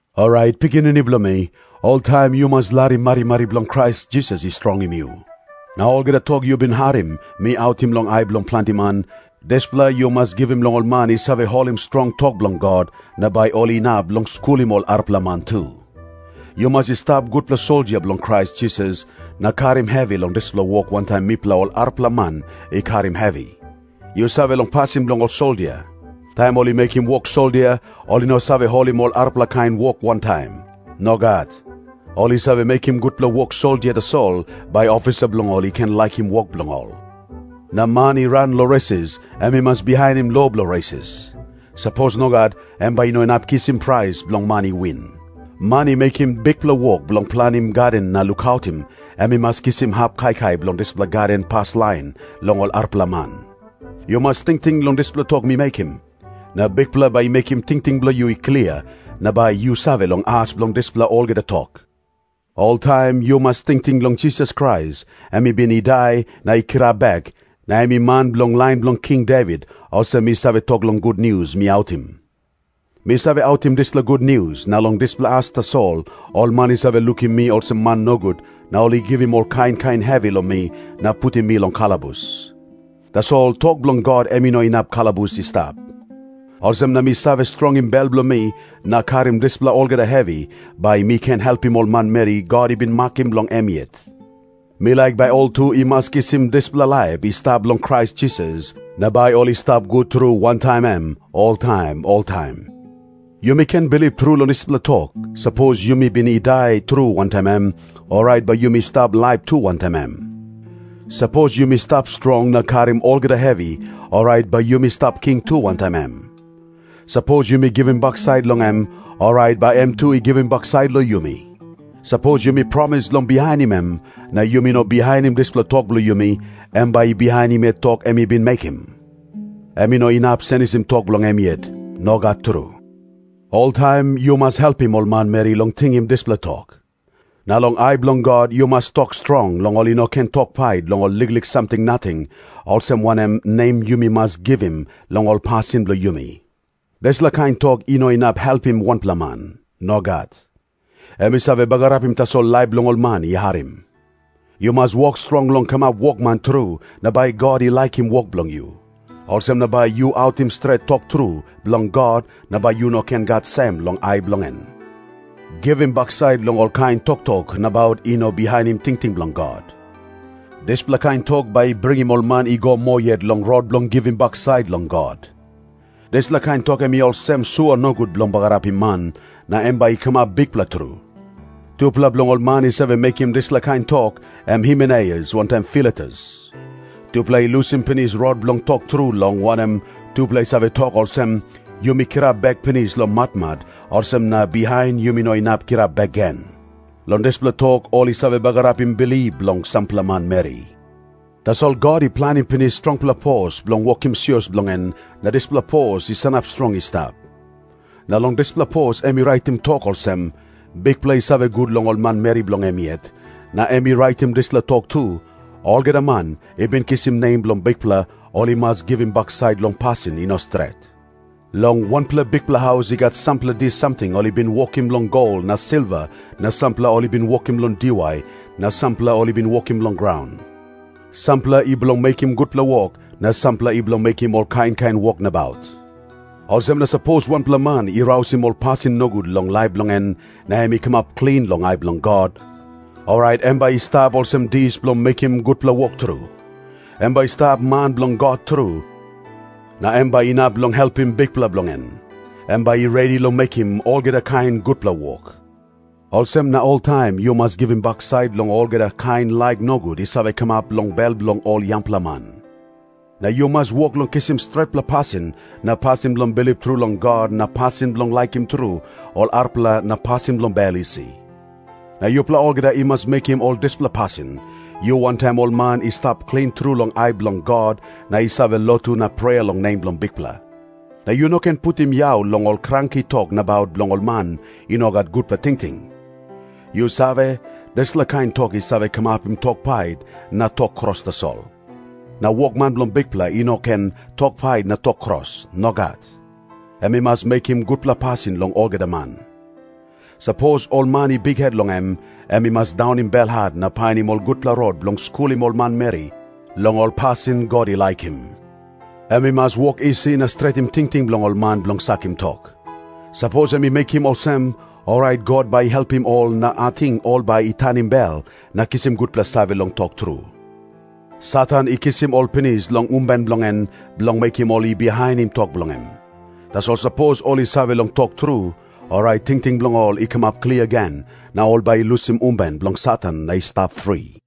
Orait, pikinini bilong mi, oltaim yu mas larim marimari bilong Krais Jisas i strongim yu. Na olgeta tok yu bin harim mi autim long ai bilong planti man, dispela yu mas givim long ol man i save holim strong tok bilong God, na bai ol inap long skulim ol arapela man tu. Yu mas i stap gutpela soldia bilong Krais Jisas na karim hevi bilong dispela wok wantaim mipela ol arapela man i karim hevi. Yu save long pasin bilong ol soldia. Taim ol i mekim wok soldia, ol i no save holim ol arapela kain wok wantaim. Nogat. Ol i save mekim gutpela wok soldia tasol, bai ofisa bilong ol i ken laikim wok bilong ol. Na man i ran long resis, em i mas bihainim lo bilong resis. Sapos nogat, em bai i no inap kisim prais bilong man i win. Man i mekim bikpela wok bilong planim gaden na lukautim, em i mas kisim hap kaikai bilong dispela gaden paslain long ol arapela man. Yu mas tingting long dispela tok mi mekim, na Bikpela bai i mekim tingting bilong yu i klia, na bai yu save long as bilong dispela olgeta tok. Oltaim yu mas tingting long Jisas Krais, em i bin i dai na i kirap bek, na em i man bilong lain bilong King Devit, olsem mi save tok long gutnius mi autim. Mi save autim dispela gutnius, na long dispela as tasol ol man i save lukim mi olsem man nogut, na ol i givim ol kain kain hevi long mi na putim mi long kalabus. Tasol tok bilong God em i no inap kalabus i stap. Olsem na mi save strongim bel bilong mi na karim dispela olgeta hevi, bai mi ken helpim ol manmeri God i bin makim bilong em yet. Mi laik bai ol tu i mas kisim dispela laip i stap long Krais Jisas, na bai ol i stap gut tru wantaim em oltaim oltaim. Yumi ken bilip tru long dispela tok, “Sapos yumi bin i dai tru wantaim em, orait bai yumi stap laip tu wantaim em. Sapos yumi stap strong na karim olgeta hevi, orait bai yumi stap king tu wantaim em. Sapos yumi givim baksait long em, orait bai em tu i givim baksait long yumi. Sapos yumi promis long bihainim em, na yumi no bihainim dispela tok bilong yumi, em bai i bihainim yet tok em i bin mekim. Em i no inap senisim tok bilong em yet. Nogat tru.” Oltaim yu mas helpim ol manmeri long tingim dispela tok. Na long ai bilong God yu mas tok strong long ol i no ken tok pait long ol liklik samting nating, olsem wanem nem yumi mas givim long ol pasin bilong yumi. Dispela kain tok i no inap helpim wanpela man. Nogat. Em i save bagarapim tasol laip bilong ol man i harim. Yu mas wok strong long kamap wokman tru, na bai God i laikim wok bilong yu. Olsem na bai yu autim stret tok tru bilong God, na bai yu no gat sem long ai bilong en. Givim baksait long olkain toktok nabaut i no bihainim tingting bilong God. Dispela kain tok bai i bringim ol man i go moa yet long rot bilong givim baksait long God. Dispela kain tok em i olsem sua nogut bilong bagarapim man, na em bai i kamap bikpela tru. Tupela bilong ol man i save mekim dispela kain tok em Himeneus wantaim Filetus. Tupela i lusim pinis rot bilong tok tru, long wanem, tupela i save tok olsem, “Yumi kirap bek pinis long matmat, olsem na bihain yumi no inap kirap bek gen.” Long dispela tok ol i save bagarapim bilip bilong sampela manmeri. Tasol God i planim pinis strongpela pos bilong wokim sios bilong en, na dispela pos i sanap strong i stap. Na long dispela pos em i raitim tok olsem, “Bikpela i save gut long ol manmeri bilong em yet.” Na em i raitim dispela tok tu, “Olgeta man i bin kisim nem bilong Bikpela, ol i mas givim baksait long pasin i no stret.” Long wanpela bikpela haus i gat sampela dis samting ol i bin wokim long gol na silva na sampela ol i bin wokim long diwai na sampela ol i bin wokim long graun. Sampela i bilong mekim gutpela wok, na sampela i bilong mekim ol kain kain wok nabaut. Olsem na sapos wanpela man i rausim ol pasin nogut long laip bilong en na em i kamap klin long ai bilong God, orait em bai i stap olsem dis bilong mekim gutpela wok tru. Em bai i stap man bilong God tru, na em bai inap long helpim Bikpela bilong en. Em bai i redi long mekim olgeta kain gutpela wok. Olsem na oltaim yu mas givim baksait long olgeta kain laik nogut i save kamap long bel bilong ol yangpela man. Na yu mas wok long kisim stretpela pasin na pasin bilong bilip tru long God na pasin bilong laikim tru ol arapela na pasin bilong bel isi. Na yupela olgeta i mas mekim ol dispela pasin, yu wantaim ol man i stap klin tru long ai bilong God na i save lotu na prea long nem bilong Bikpela. Na yu no ken putim yau long ol kranki tok nabaut bilong ol man i no gat gutpela tingting. Yu save, dispela kain tok i save kamapim tok pait na tok kros tasol. Na wokman bilong Bikpela i no ken tok pait na tok kros. Nogat. Em i mas mekim gutpela pasin long olgeta man. Sapos ol man i bikhet long em, em i mas daunim belhat na painim ol gutpela rot bilong skulim ol manmeri long ol pasin God i laikim. Em i mas wok isi na stretim tingting bilong ol man bilong sakim tok. Sapos em i mekim olsem, orait God bai i helpim ol na ating ol bai i tanim bel na kisim gutpela save long tok tru. Satan i kisim ol pinis long umben bilong en, bilong mekim ol i bihainim tok bilong em. Tasol sapos ol i save long tok tru, orait tingting bilong ol i kamap klia gen, na ol bai i lusim umben bilong Satan na i stap fri.